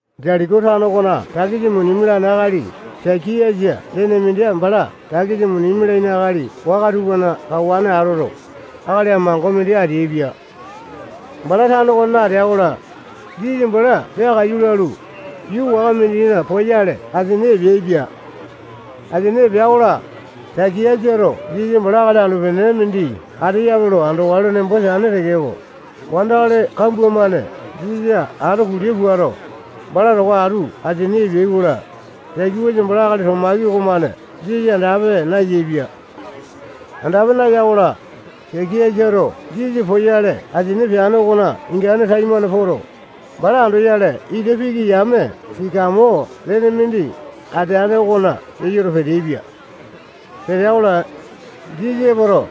Jetiko tano okona takisa muni mialane akali Sakiasa lene mindi bala takisa muni mialaini akali waka tupana kawane atoto, akali amango mindi ateaipia. Bala tano okonena atea-kola, Jisasa bala peakaiyu lalu, yuu waka mindina poyale asini epeaipia. Asini epea-kola, Sakiasato Jisasa bala akali anu-pene mindi ateyape lo andokale nembo teane tekeko, wandakali kambua-mane Jisasa ato kulia puato, bala towa atu asini epeai-kola, Sakiasa bala akali topaki okomane Jisasa andape nayaepia. Andape naya-kola, Sakiasato Jisasa poyale asini peane okona ingane taimane poto, bala andoyale ita piki yame sikamo lene mindi ateane okona keyoto, peteaipia. Petea-kola, Jisasa epoto,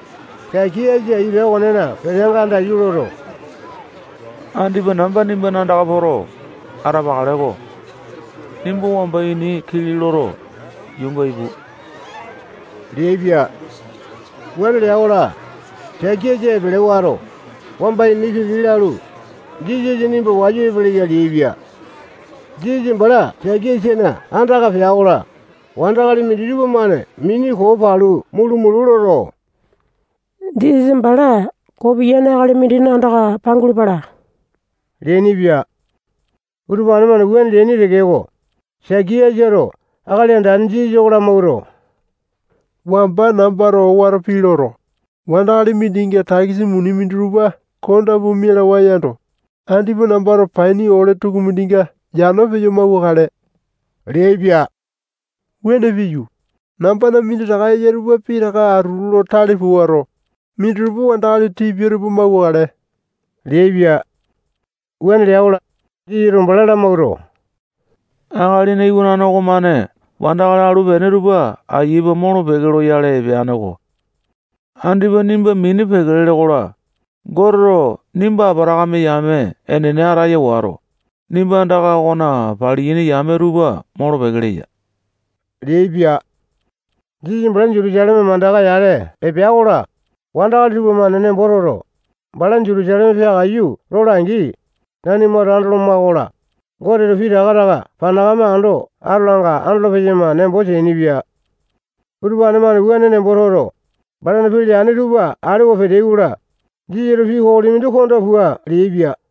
Sakiasa ita okonena peteanga andaiyu loto, andipa namba nimbana andaka poto, atapakale-ko. Nimba wamba ini kili loto, yuunga ipu leaipia. Wuane lea-kola, Sakiasa epele wato, wamba ini kili lalu, Jisasa nimba wayu epeleya leaipia. Jisasa bala Sakiasana andaka pea-kola, wandakali minditupa-mane mini koo palu mulu-mulu loto, Jisasa bala koo piyane akali mindina andaka pangulu pala leainipia. Utupane-mane wuane leaini tekeko, Sakiasato Akali Andane Jisasa oko lamawuato, wamba nambato owato pii loto, wandakali mindinga takisa muni minditupa konda pua mialawae yando, andipa nambato paini ole tukumindinga yano peyo mauwakale leaipia. Wuane piyu, nambana minditaka eya tupa pitaka atutu lo tale puato, minditupa wandakali tipia tupa mauwakale leaipia. Wuane lea-kola, Jisasato bala lamawuato, Akalina Iwanane okomane wandakali alu-pene tupa ayia pua molo-peke loyale epeane-ko. Andipa nimba mini peke lele-kola, Goteto nimba Apatakame yame enene ataya wato, nimbana anda okona paliyaini yame tupa molo-peke leya leaipia. Jisasa bala Jutusaleme mandaka yale epea-kola, wandakali tupamane nembo toto, bala Jutusaleme peakaiyu lola-angi, nanimato andoloma-kola, Goteto pitaka taka panakame ando atolanga andolo-peyama nembo teainipia. Utupane-mane wuane nembo toto, balana pii leane tupa alewa peteai-kola, Jisasato pii kokoli mindi konda pua leaipia.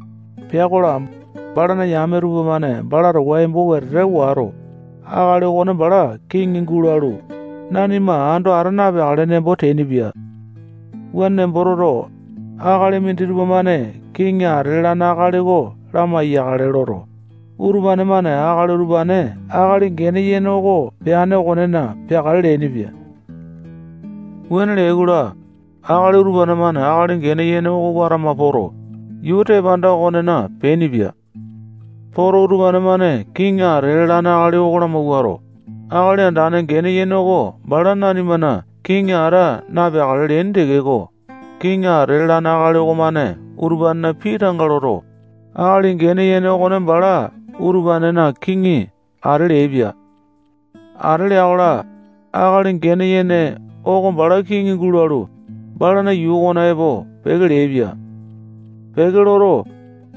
Pea-kola, balana yame tupamane bala towa embo wetete wato, akali okone bala kiŋi gulalu, nanima ando ata napeakale nembo teainipia. Wuane nembo toto, akali minditupa-mane kiŋi ate lalane akali oko lamai-yakale loto, utupane-mane akali utupane akali gene yene oko peane okonena peakale leainipia. Wuane leai-kola, akali utupane-mane akali gene yene oko watama poto, yuu tepanda okonena peainipia. Poto, utupane-mane kiŋi ate lalane akali oko lamawuato, akali andane gene yene oko bala nanimana kiŋi ata napeakale leaini tekeko, kiŋi ate lalane akali okomane utupanena pii tanga loto, akali gene yene okone bala utupanena kiŋi ate leaipia. Ate lea-kola, akali gene yene oko bala kiŋi gulalu, balana yuu okona epo peke leaipia. Peke loto,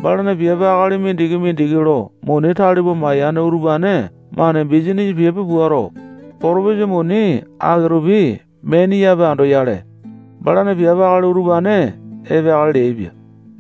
balana piape akali mindiki-mindiki lo muni tale pua mayane utupane-mane bisanisa piape puato, potopisa muni aki-tupi meaini yape andoyale, balana piape akali utupane epeakale leaipia.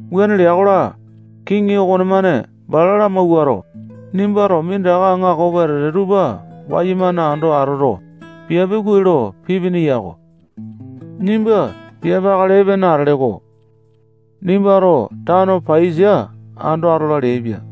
Wuane lea-kola, kiŋi okonemane bala lamawuato, nimbato minditaka aŋako wetete tupa wayumane ando atoto, piape kuai lo pipini yako. Nimba piape akali epene atele-ko. Nimbato tano paiyasa ando atola leaipia.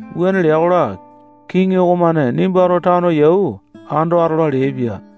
Wuane lea-kola, kiŋi okomane nimbato tano yau ando atola leaipia.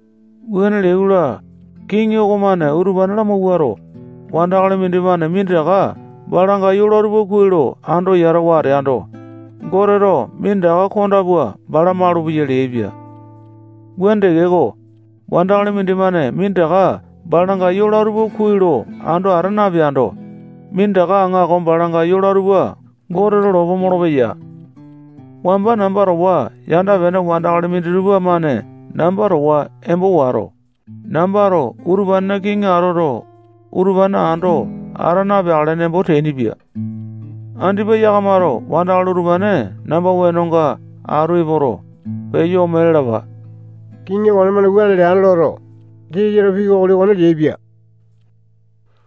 Wuane leai-kola, kiŋi okomane utupane lamawuato, wandakali mindimane minditaka balanga yola tupa kuai lo ando yatawa ateando, Goteto minditaka konda pua bala malupeya leaipia. Wuane tekeko, wandakali mindimane minditaka balanga yola tupa kuai lo ando ata napeando, minditaka aŋako balanga yola tupa Goteto lopo molopeya. Wamba namba towa yanda-pene wandakali minditupa-mane namba towa embo wato, nambato utupanena kiŋi atoto, utupane ando ata napeakale nembo teainipia. Andipa yakamato wandakali utupane namba wenonga atu epoto, peyo ome lalapa. Kiŋi okonemane wuane leane loto, Jisasato pii kokoli okone leaipia.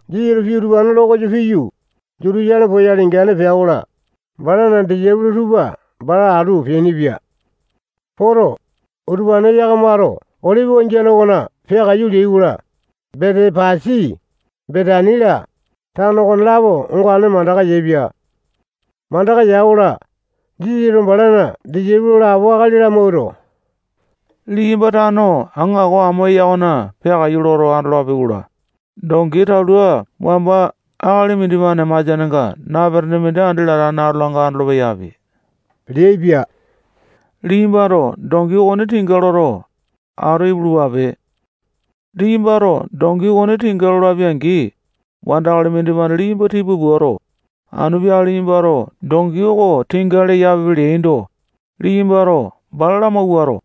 Jisasato pii utupane lo koyo piyu, Jutusaleme poyale ingane pea-kola, balana disaipolo tupa bala atu peainipia. Poto, utupane yakamato Olipi wangiane okona peakaiyu leai-kola, Betepasi, Betani-la, tano okonelapo ongane mandaka yaepia. Mandaka ya-kola, Jisasato balana disaipolo lapo akali lamawuato, liyamba tano aŋako amo eya okona peakaiyu loto andolapi-kola, dongi talua wamba akali mindimane masianenga napetene mindi andi latane atolanga andolo-peyapi leaipia. Liyambato dongi okone tinga loto, atu ipulupape. Liyambato dongi okone tinga lolapi-angi, wandakali mindimane liyamba tipa puato, anu peakale liyambato dongi oko tinga leyapipe leaindo, liyambato bala lamawuato,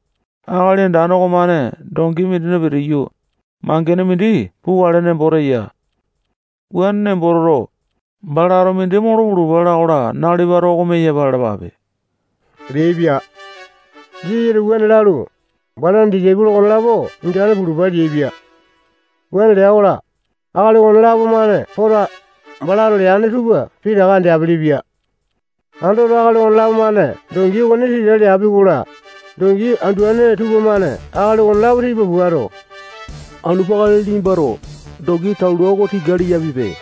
Akali Andane okomane dongi mindina pitiyu, mangene mindi pukale nembo teya. Wuane nembo toto, balato mindi molo pulupa leanga nalipato oko meyapa lalapape leaipia. Jisasato wuane lalu, balana disaipolo okonelapo ingane pulupa leaipia. Wuane lea-kola, akali okonelapo-mane poto, balato leane tupa pitaka andeapele-pia. Andoto, akali okonelapo-mane dongi okone tinga leapi-kola, dongi anduane tupamane akali okonelapo tipa puato, anu peakale liyambato dongi talua oko tinga leyapipe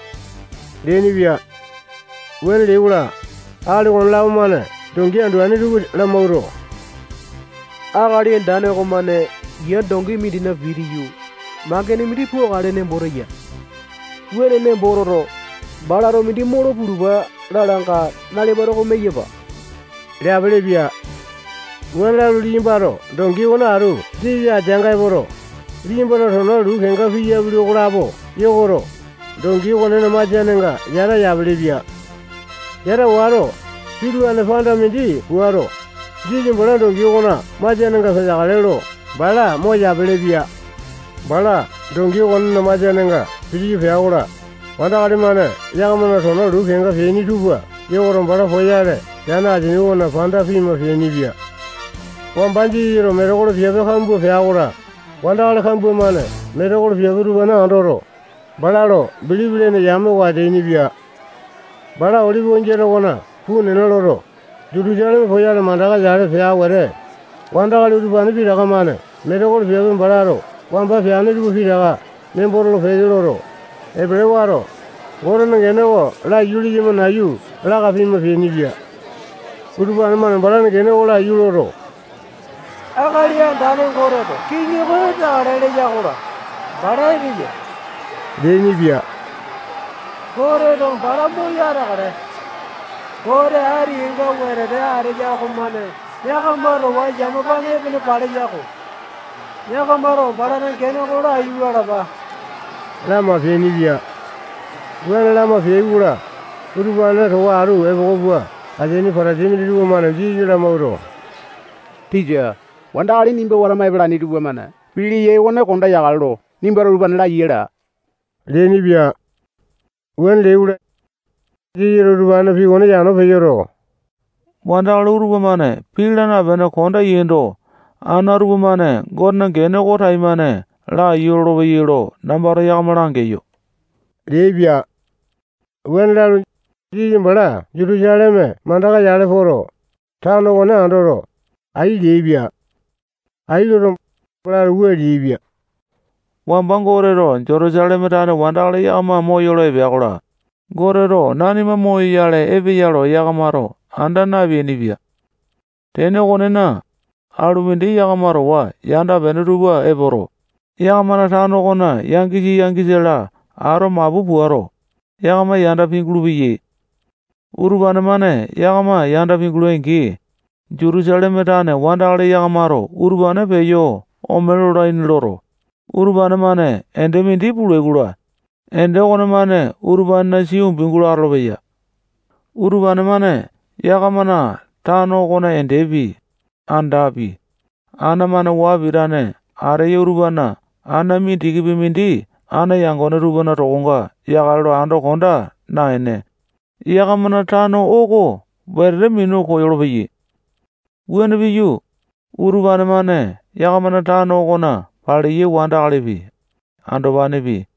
leainipia. Wuane leai-kola, akali okonelapo-mane dongi anduane tupa lumauwato, Akali Andane okomane yia dongi mindina pitiyu, mangene mindi pukale nembo teya. Wuane nembo toto, balato mindi molo pulupa leanga nalipato oko meyapa leapelepia. Wuane lalu, liyambato dongi okone atu Jisasa ateanga epoto, liyambana tona luu kenga peapili okolapo yokoto, dongi okonena masianenga yata yapelepia. Yata wato, pitulane panda mindi puato, Jisasa bala dongi okona masianenga peteakale lo bala moyapele-pia. Bala dongi okonena masianenga pitiyu pea-kola, wandakali-mane yakamana tona luu kenga peapili tupa yokoto, bala poyale epeane asini okona panda pima peainipia. Wamba Jisasato metekolo piape kambua pea-kola, wandakali kambua-mane metekolo piape utupane andoto, bala lo bilipi lene yame oko ateainipia. Bala Olipi wangiane okona puu nena loto, Jutusaleme poyale mandaka yale pea wete, wandakali utupane pitaka-mane metekolo piape balato wamba peane tupa pitaka nembo tolo-peke loto, epele wato, Gotena gene oko laiyu leyama nayu laka pima peainipia. Utupane-mane balana gene oko laiyu loto, Akali Andane Goteto kiŋi oko epeakale leya-kola, bala epeya leainipia. Goteto bala moyo ateakale. Gote ati kenga wetete ateya okomane yakama towa yamapane epene paleya-kola, yakamato balana gene oko laiyu lalapa lama peainipia. Wuane lama peai-kola, utupane towa atu epoko pua ateaini Patasai minditupa-mane Jisasa lamawuato, tisa, wandakali nimba watama epalaini tupamane pii leyai okone konda yakale lo nimbato utupane laiya laa leainipia. Wuane leai-kola, Jisasato utupanena pii okone yano peyoto, wandakali utupa-mane pii laa napene konda yaindo, ana tupamane Gotena gene oko taimane laiyu lolopeyai lo nambato yakama langeyo leaipia. Wuane lalu, Jisasa bala Jutusaleme mandaka-yale poto, tano okone andoto, ai leaipia. Ai loto, balato wua leaipia: Wamba Goteto Jutusaleme tane wandakali yakama moyolo epea-kola, Goteto nanima moyoyale epeya lo yakamato anda napeainipia. Tene okonena, alumindi yakama towa yanda-pene tupa epoto, yakamana tano okona yangisa, yangisa-la ato mapu puato, yakama yanda pingulu-peyai. Utupane-mane yakama yanda pingulai-angi, Jutusaleme tane wandakali yakamato utupane peyo ome lolaini loto, utupane-mane ende mindi pulai-kola, ende okonemane utupanena sia umbi gulo atolopeya. Utupane-mane yakamana tano okona endepi, andapi, ana-mane waa pitane ateya utupanena ana mindikipi mindi ana yangone tupana tokonga yakale lo ando konda naene, yakamana tano oko wetete minu koyolo-peyai. Wuane piyu, utupane-mane yakamana tano okona paleyai wandakalipi, andopanepi,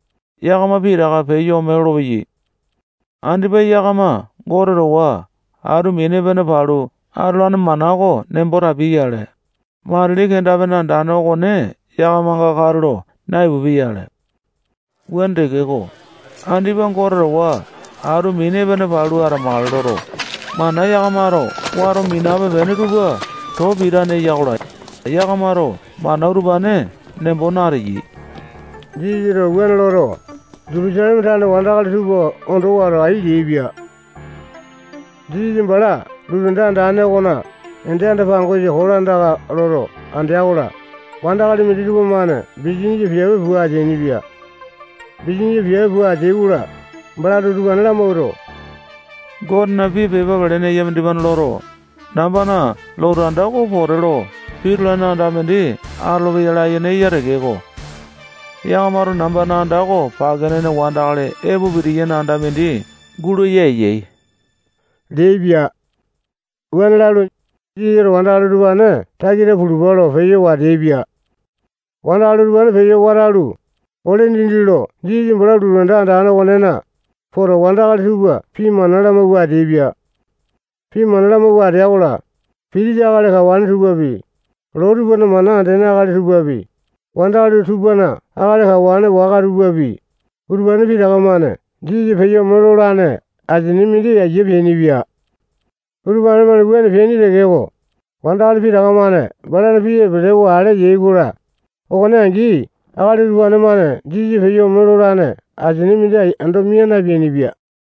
yakama pitaka peyo ome lolopeyai. Andipa yakama Gote towa atu mini epene palu atolane mana oko nembo tapiai-yale, matili kenda-pene andane okone yakamanga katulo naipupia-yale. Wuane tekeko, andipa Gote towa atu mini epene palu atamakale loto, mana yakamato wato minape-pene tupa too pitane eya-kola, yakamato mana utupane nembo nateyai. Jisasato wuane loto, Jutusaleme tane wandakali tupa ondo wato, ai leaipia. Jisasa bala lotu anda andane okona ende anda-pangosa kolandaka loto andea-kola, wandakali minditupa-mane bisanisa piape pua ateainipia. Bisanisa pua ateai-kola, balato utupane lamawuato, Gotena pii pepa pelene eya mindimane loto, nambana lotu anda oko pote lo pitulane anda mindi atolopeya layene eya tekeko, yakamato nambana anda oko pake nene wandakali epo pitiyaini anda mindi gulaya yaini leaipia. Wuane lalu, Jisasato wandakali utupane takita pulupa lo peyo wateaipia. Wandakali utupane peyo watalu, ole dindi lo Jisasa bala lotu anda andane okonena epoto, wandakali tupa pii mana lamawua ateaipia. Pii mana lamawua atea-kola, pitisa akali kawane tupapi, loo tupana mana andene akali tupapi, wandakali tupana akali kawane waka tupapi, utupane pitaka-mane Jisasa peyo ome lolane asia mindi ayia peainipia. Utupane-mane wuane peaini tekeko, wandakali pitaka-mane balana pii epelewa ale yai-kola, okone angi akali utupane-mane Jisasa peyo ome lolane asia mindi ando mia napeainipia.